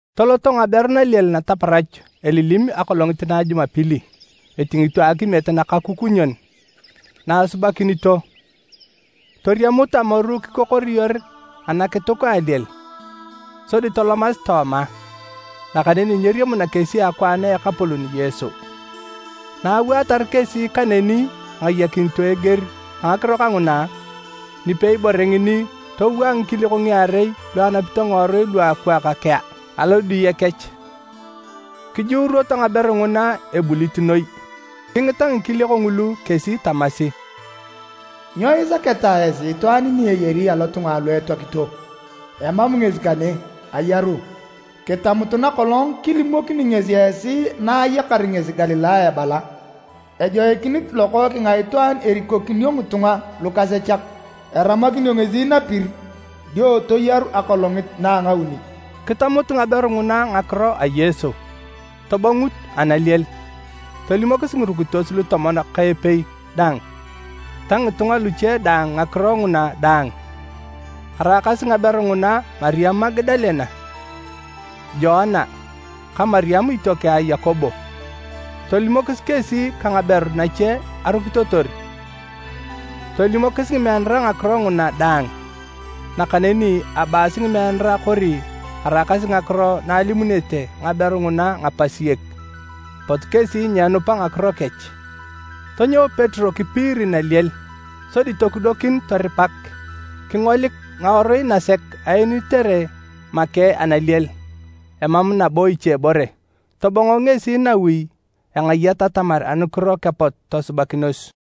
Toloto ngaberu naliel nataparach elilim akolongit na a Jumapili, etingito akimiet nakakukunyon na asubakinito. Toriamut amoru kikokoriyor anakituk a aliel, sodi tolomasi tooma, nakaneni nyeriamuna kesi akwaan a Ekapolon Yesu. Na awaatar kesi kaneni engayakinito eger a ngakiro kanguna, nipei bore ngini towaa ngikiliok ngiarei lu anapito ngiworui luakwaak kea alodiye kech. Kijuuruoto ngaberu nguna ebulit noi, kingita ngikiliok ngulu kesi tamasi, “Nyo isaketa esi itwaan ni eyari lotunga lu etoakito? Emam ngesi kane, ayaru. Kitamutu nakolong kilimokini ngesi esi na ayakar ngesi Galilaya ebala, ‘Ejoikinit Lokookeng a Itwaan erikokinio ngitunga lukasechak, eramakinio ngesi napir, dio toyaru akolongit na a ngauni.’” Kitamut ngaberu nguna ngakiro a Yesu, tobongut analiel, tolimokis ngirukitos lutomon ka epei daang ta ngitunga luche daang ngakiro nguna daang. Araakasi ngaberu nguna Mariam Magadalene, Joana, ka Mariam itiokeng a Yakobo, tolimokis kesi ka ngaberu nache arukitotor, tolimokis ngimeanara ngakiro nguna daang. Nakaneni abaasi ngimeanara kori araakasi ngakiro na alimunete ngaberu nguna ngapasiek, apot kesi nyeenupa ngakiro kech. Tonyou Petero kipiiri naliel. Sodi tokudokin toripak, kingolik ngawarui nasek aenitere make analiel, emam nabo ichebore. Tobongo ngesi nawi engayat atamar anukiro kepot tosubakinos.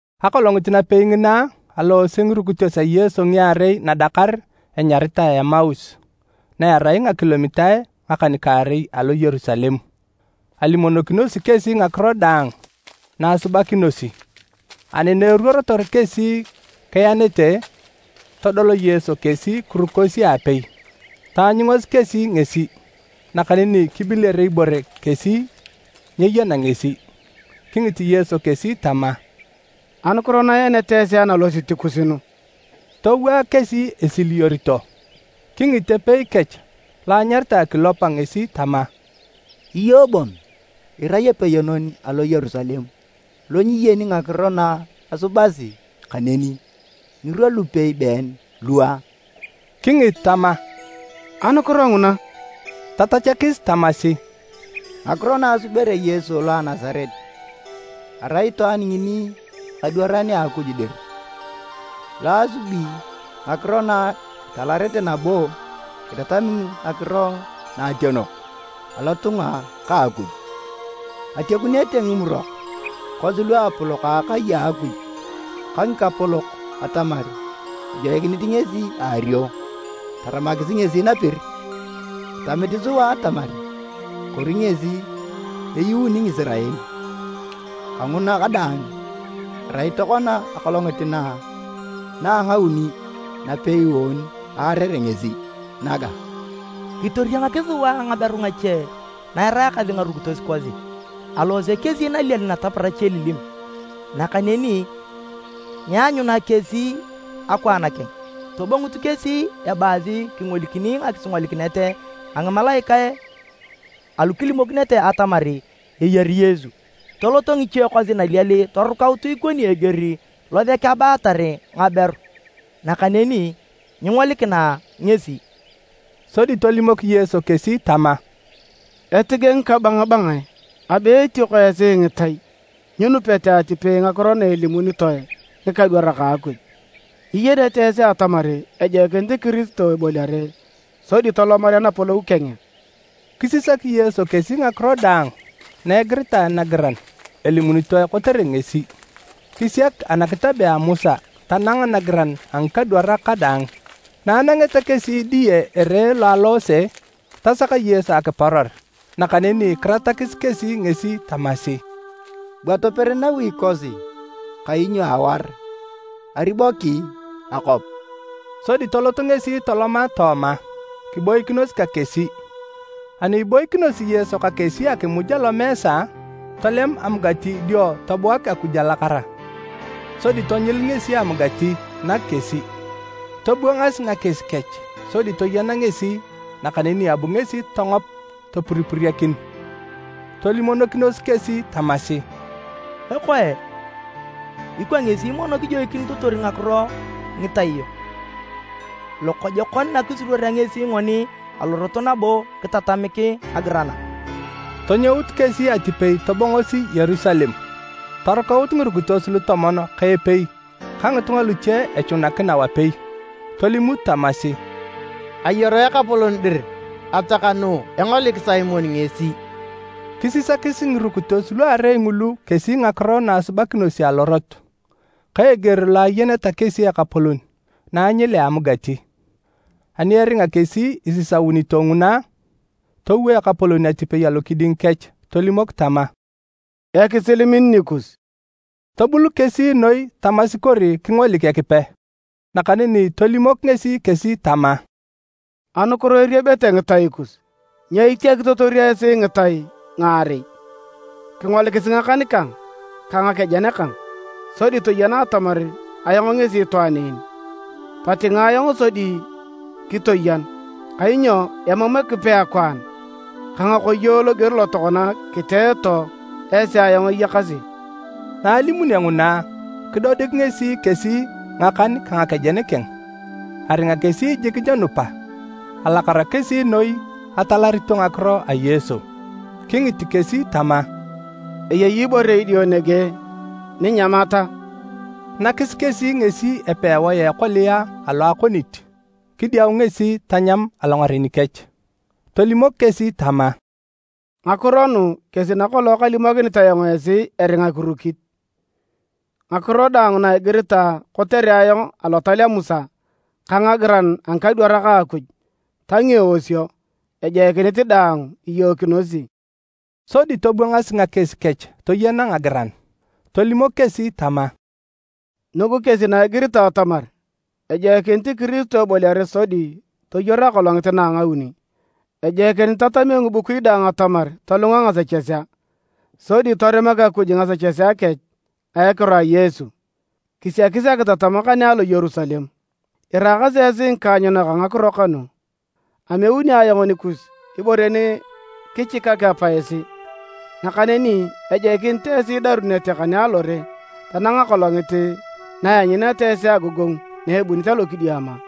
Akolongit napei ngina, aloose ngirukitos a Yesu ngiarei nadakar enyaritae Emaus, na erai ngakilomitae ngakan-kaarei alo Yerusalem. Alimonokinosi kesi ngakiro daang na asubakinosi. Ani na eruorotor kesi kiyanete, todol Yesu kesi kirukosi aapei. Taanyungasi kesi ngesi, nakaneni kibiler ibore kesi nyeyana ngesi. Kingit Yesu kesi tama, “Anukiro na ianete esi analosit kus nu?” Towaa kesi esiliyorito. Kingit epei kech lo anyaritae Kilopa ngesi tama, “Iyong bon irai epeyonon alo Yerusalem lo nyiyeni ngakiro na asubasi kaneni ngirwa lupei been lua?” Kingit tama, “Anukiro nguna?” Tatachakis tamasi, “Ngakiro na asubere Yesu lo a Nasaret. Arai itwaan ngini ekadwaran a Akuj dir, lo asubi ngakiro nakitalarete nabo kitatami ngakiro nakationok alotunga ka Akuj. Atiakunete Ngimurok kosi luapolok a akai a Akuj ka ngikapolok atamar ejoikinit ngesi eario. Taramakis ngesi napir. Kitamit sua atamar kori ngesi eyuuni Ngisirael! Kanguna kadaang, erai tokona akolongit na a ngauni napei ngoon aarere ngesi naga. Kitoriangakis sua ngaberu ngache na eraakasi ngarukitos kosi, aloose kesi naliel nataparach elilim, nakaneni nyeanyuna kesi akwaan keng. Tobongut kesi ebaasi kingolikini akisingolikinet a ngimalaikae alu kilimokinete atamar eyari Yesu! Toloto ngiche kosi naliel torukaut ikoni eger losek abaatar ngaberu, nakaneni nyingolikina ngesi.” Sodi tolimok Yesu kesi tama, “Etige ngikabangabangae, abe etioko esi ngitai, nyinupete atipei ngakiro na alimunete ngikadwarak a Akuj! Nyiyenete esi atamar ajoikinit Kiristo eboliare sodi tolomarea napolou keng a?” Kisisak Yesu kesi ngakiro daang na egiritae nagiran elimunitoe kotere ngesi, kisiak anakitabea a Musa tanang nagiran a ngikadwarak kadaang. Na anangeta kesi diyete ere lo aloose, tasak Yesu akiporor, nakaneni kiratakis kesi ngesi tamasi, “Bua toper nawi kosi kainyo awaar, ariboki akwap.” Sodi tolot ngesi toloma tooma, kiboikinos ka kesi. Ani iboikinosi Yesu ka kesi akimuj alomeesa, tolem amugati dio tobuak Akuj alakara, sodi tonyil ngesi amugati, nak kesi. Tobwangas ngakies kech sodi toyena ngesi, nakaneni abu ngesi tongop topuripuriakin. Tolimonokinos kesi tamasi, “Ekoe, ikwa ngesi mono kejoikinitotor ngakiro ngitai yok lokojokon na kisuruorea ngesi ngoni alorot nabo kitatamik ngagiran a?” Tonyout kesi atipei tobongosi Yerusalem. Torukaut ngirukitos lutomon ka epei ka ngitunga luche echunakina wapei, tolimut tamasi, “Ayaru Ekapolon dir! Atakanuu engolik Simon ngesi!” Kisisakis ngirukitos luarei ngulu kesi ngakiro na asubakinosi alorot, ka eger lo ayeneta kesi Ekapolon na anyilea amugati. Ani eringa kesi isisaunito nguna, towo Ekapolon atipei alokiding kech tolimok tama, “Ekisil min nikus.” Tobul kesi noi tamasi kori kingolik Ekipe. Nakaneni tolimok ngesi kesi tama, “Anukiro eriebete ngitai kus? Nyo itiakitotor esi ngitai ngaarei? Kingolikisi ngakan kang ka ngakejen kang, sodi toyena atamar ayong ngesi itwaan en. Totingae ayong sodi kitoyan, kainyo emam Ekipe akwaan ka ngakoyo loger lo tokona kiteeto esi ayong eyakasi.” Na alimunio nguna, kidodik ngesi kesi ngakan ka ngakejen keng. Aringa kesi jik nyenupa, alakara kesi noi etalarito ngakiro a Yesu. Kingit kesi tama, “Eyei ibore idio nege ninyamat a?” Nakis kesi ngesi epewae a ekolia alo akonit. Kidiau ngesi tanyam alongaren kech. Tolimok kesi tama, “Ngakiro nu kesi nakolong kalimokinit ayong esi eringa kirukit: Ngakiro daang na egiritae kotere ayong Alotal a Musa ka ngagiran a ngikadwarak a Akuj, ta ngieosio, ejoikinit daang iyookinosi.” Sodi tobwangas ngakies kech toyena ngagiran. Tolimok kesi tama, “Nugu kesi na igiritae atamar, ejoikinit Kiristo eboliare sodi toyaru akolongit na ngauni. Ejoikinit itatamio ngibukui daang atamar tolunga ngasechesea, sodi torimak Akuj ngasechesea kech a ekiro a Yesu. Kisiakis akitatam kane alo Yerusalem. Iraakasi esi ngikaanyunak a ngakiro kanu. Ameuni ayong nikus ibore ni kichikak Apa esi. Nakaneni ejoikinit esi idarunete kane alore tanang akolongit na ianyuneta esi agogongu na ebunit alokidiama.”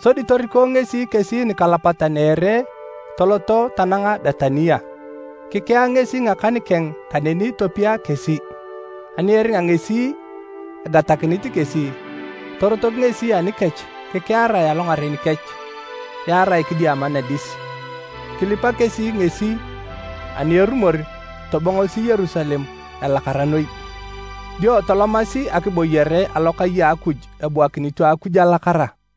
Sodi toriko ngesi kesi nikalapatan a ere toloto tananga Betania. Kikea ngesi ngakan keng kaneni topia kesi. Ani eringa ngesi egatakinit kesi, torotok ngesi anikech kikiarae alongaren kech, yaarae kidiama nadis. Kilipa kesi ngesi ani erumor tobongosi Yerusalem elakara noi, dio tolomasi akibooyere alokai a Akuj ebuakinito Akuj alakara.